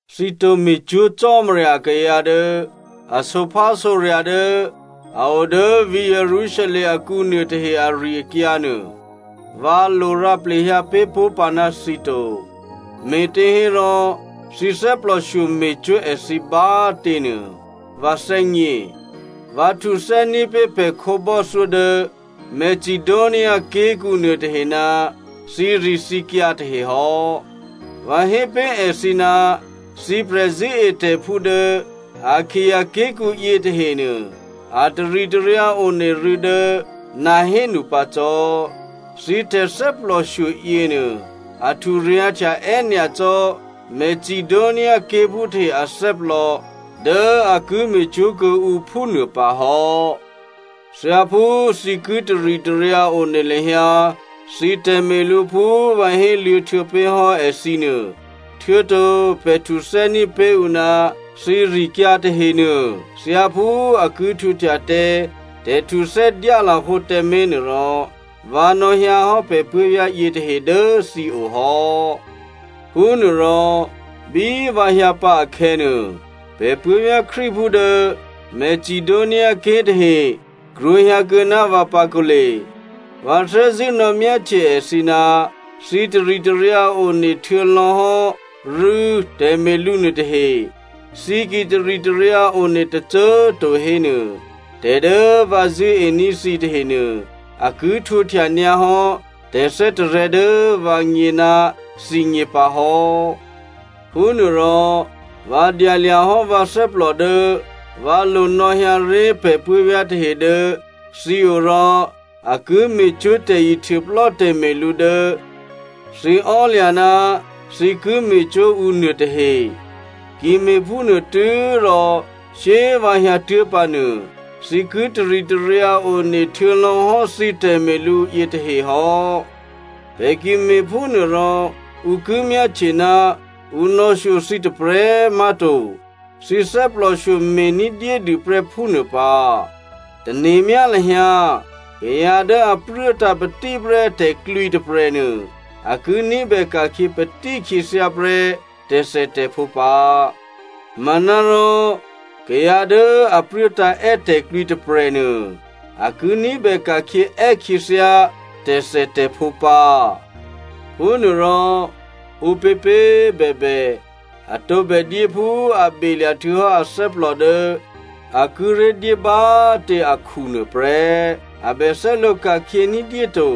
Thǐ tǒ me̤cwó̤ Cò́marya akayǎ dố a sǒphásǒrya̤ dố a o dố vǐ̤ Jerusalem akǔ nuôtahe ari-akyǎ nuô, vǎ lo rǎ plehyǎ pé̤ pó̤ pǎ ná thǐ to. Me̤těhérò thǐ thè́plòshyo me̤cwó̤ èthǐ bá꤮ tě nuô, vǎ thè́gně. Vǎ htuthè́ní̤ pé̤ pè̤ khǒbò́thyó dố Macedonia ké̤kǔ nuôtahe ná thǐrithǐkyǎ tahe hò́. Vǎ hé pé̤ èthǐ ná thǐ prè̤zṳ̂́etè̤phú dố Akaia ké̤kǔ yětahenuô, a taritaryǎ one rû̌ dố nahénu pǎ cò́. Thǐ tè̤thè́plòshyo yěnuô, a hturyǎ̤htya è́nyacò́ Macedonia ké̤phú tahe athè́plò dố a ki me̤cwó̤ kuô̌ǔ phúnuô pǎ hò́. Thyáphú thǐ ki taritaryǎ one lahyǎ thǐ tè̤me̤lǔ phú vǎ héluô̌htuô̌ pé̤ hò́ èthǐ nuô, htuô̌to pè̤ htuthè́ní̤ pé̤ ǔ ná thǐrikyǎ tahenuô, thyáphú a ki htwǒhtya tǎ tè̤htuthè́ dyálahǒ tǎmé̤ nuôrò, vǎ nò̌hyǎhò́ pè̤ puố̤vyá̤ yětahe dố thǐo hò́. Phúnuôrò bí vǎ hyǎ pǎ akhè̌nuô, pè̤ puố̤vyá̤ Krístuphú dố Macedoniaké̤ tahe krwǒhyǎkuô̌ ná vǎ pǎ kǒle. Vǎ thè́zṳ̂́ nò̌myáhtye èthǐ ná thǐ taritaryǎ one htuô̌lò̌ hò́ rû̌ tè̤me̤lǔ nuôtahe. Thǐ ki taritaryǎ one tôcô꤮ to hénuô, tè̤ dố vǎ zṳ̂́ení̤ thǐ tahenuô a ki htwǒhtya nyǎhò́ tè̤thè́tarè̤̌ dố vǎgně ná thǐgně pǎ hò́. Phúnuôrò, vǎ dyalya̤ hò́ vǎ thè́plò dố vǎ lo nò̌hyǎ ré̤ pè̤ puố̤vyá̤ tahe dố thǐo rò a ki me̤cwó̤ tè̤ihtuôplò́ tè̤me̤lǔ dố thǐ ò́lya̤ ná thǐ ki me̤cwó̤ ǔ nuôtahe. Ki me̤phúnuô tû́rò shyé꤮ vǎ hyǎtuố̤ pǎnuô, thǐ ki taritaryǎ one htuô̌lò̌hò́ thǐ tè̤me̤lǔ yětahe hò́. Pè̤ ki me̤phúnuôrò ǔ ki myáhtye ná ǔ nò̌shyo thǐ tôprè̤꤮ má̤to, thǐ thè́plòshyo me̤ ní̤dyédû prè́ phúnuô pǎ. Tane̤myá lahyǎ kayǎ dố a pruốtǎ̤ patíprè́ tè̤klwǐ tôprè̤nuô a ki ní̤bè ka̤khyě patí khyěthyá prè́ tè̤thètè̤phǒ pǎ. Manárò kayǎ dố a pruốtǎ̤ è́ tè̤klwǐ tôprè̤nuô, a ki ní̤bè ka̤khyě è́ khyěthyá tè̤thètè̤phǒ pǎ. Phúnuôrò, ǔpěpě꤮ bèbè, a tǒbè dyé phú a belya̤ htuô̌hò́ athè́plò dố a kíré̤ dyé bá꤮ tě akhunuô prè́. A bè thè́lǒ ka̤khyě ní̤dyé to.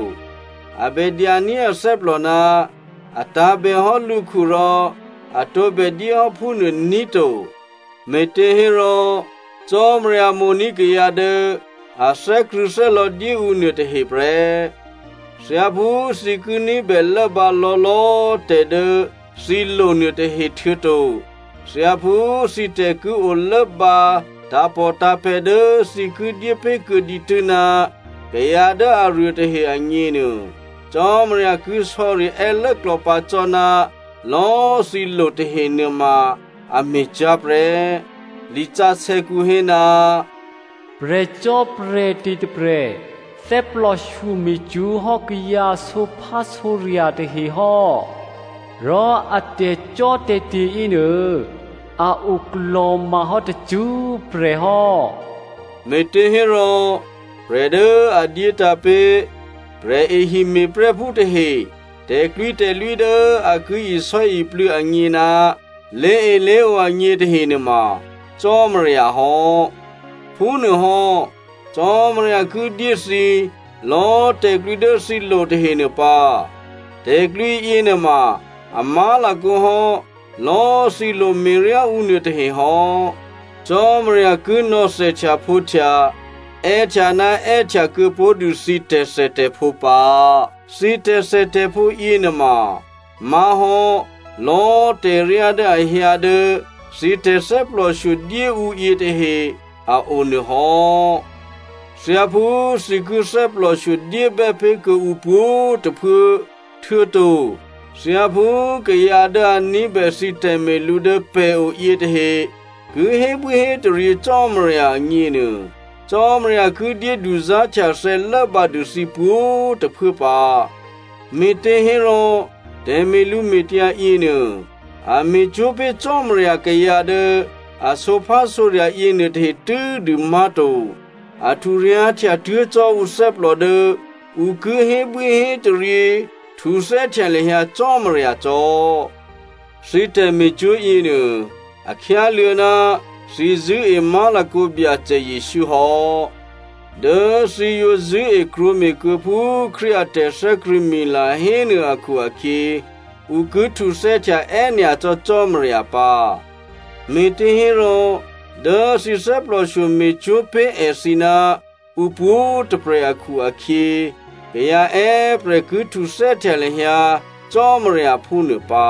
A bè dyaní̤ athè́plò ná a tǎ̤bèhò́ lǔkhu rò a tǒbè dyéhò́ phúnuô ní̤ to, me̤těhérò Cò́marya mo̤ní̤ kayǎ dố a thè́krṳ̂̌thè́lò̌ dyéǔ nuôtahe prè́. Thyáphú thǐ ki ní̤bè lốbǎ lò̌lò̌꤮ tè̤ dố thǐ lo nuôtahe, htuô̌to thyáphú thǐ tè̤ ki o lốbǎ tǎ̤pòtǎ̤pè̤̌ dố thǐ ki dyépé̤kuô̌ dǐtû́ ná kayǎ dố aruôtahe agněnuô, Cò́marya ki sò̌ri è́ lốklò̌pǎ cò́ ná lò̌꤮ thǐ lo tahe nuôma a me̤cyá̤ prè́. Lisǎsè̌kǔ hé, “Prè̤cò́prè̤te̤ tôprè̤ thè́plòshyo me̤cwó̤ hò́ kayǎ sǒphásǒrya̤ tahe hò́, rò a tè̤cò́tè̤te̤ yěnuô, a oklò̤ma hò́ tacṳ́prè̤ hò́.” Me̤těhérò prè̤ dố a dyétǎ̤ pé̤ prè̤ehime̤prè́phú tahe tè̤klwǐtè̤lwí dố a ki isò́iplû̌ agně ná lé̤elé̤ǒ agně tahe nuôma Cò́marya hò́. Phúnuôhò́, Cò́marya ki dyé thǐ lò̌꤮ tè̤klwǐ dố thǐ lo tahenuô pǎ. Tè̤klwǐ yěnuôma a má̤lakǒ hò́ lò̌꤮ thǐ lo me̤ryá ǔ nuôtahe hò́. Cò́marya ki nò̌ thèhtyaphǒhtya è́htya ná è́htya kuô̌pó̤dû thǐ tè̤thètè̤phǒ pǎ. Thǐ tè̤thètè̤phǒ yěnuôma má̤hò́ lò̌꤮ tè̤ryá dố a hyǎ dố thǐ tè̤thè́plòshyo dyéǔ yětahe a o nuô hò́. Thyáphú thǐ ki thè́plòshyo dyébè́ pé̤ kuô̌ǔ pwǒ̤꤮ tôphuố, htuô̌to thyáphú kayǎ dố a ní̤bè thǐ tè̤me̤lǔ dố pè̤o yětahe ki hébwíhétaryě Cò́marya agněnuô Cò́marya ki dyé duzá̤htyathè̌ lốbǎdû thǐ pwǒ̤꤮ tôphuố pǎ. Me̤těhérò tè̤me̤lǔme̤tyǎ yěnuô a me̤cwó̤ pé̤ Cò́marya kayǎ dố a sǒphásǒrya̤ yěnuôtahe tû́dû má̤to, a hturyǎ̤htya tuố̤ cò́ ǔthè́plò dố ǔ ki hébwíhétaryě htuthè́htya lahyǎ Cò́marya cò́. Thǐ tè̤me̤cwó̤ yěnuô a khyáluô̌ ná thǐ zṳ̂́e má̤lakǒ Byacè Jesǔ hò́. Dố thǐ yǒ zṳ̂́e krwǒme̤kuô̌ phú Krístu a tè̤thè́krṳ̂̌mila hénuô akhu-akhyě ǔ ki htuthè́htya è́nyacò́ Cò́marya pǎ. Me̤těhérò dố thǐ thè́plòshyo me̤cwó̤ pé̤ èthǐ ná ǔ pwǒ̤꤮ tôprè̤ akhu-akhyě, kayǎ è́prè̤ ki htuthè́htya lahyǎ Cò́marya phúnuô pǎ.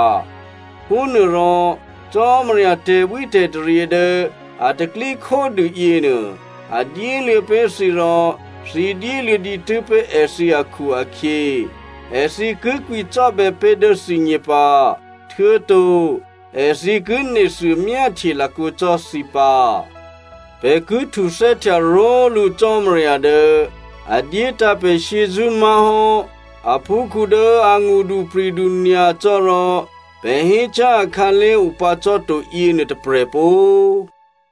Phúnuôrò Cò́marya tè̤bwítè̤taryě dố a taklíkhódû yěnuô, a dyéluô̌ pé̤ thǐ rò thǐ dyéluô̌ dǐtû́ pé̤ èthǐ akhu-akhyě, èthǐ ki kwǐcò́bè̌ pé̤ dố thǐgně pǎ, htuô̌to èthǐ ki nethuô myáhtye lakǒ cò́ thǐ pǎ. Pè̤ ki htuthè́htya ró̤lǔ Cò́marya dố a dyétǎ̤ pè̤ shyězṳ́ má̤hò́ aphúkhǔ dố a ngṳdupri̤du nyacò́ rò pè̤ hécyá̤ akhǎlé̤ opǎ cò́ to yěnuô tôprè̤ pó꤮.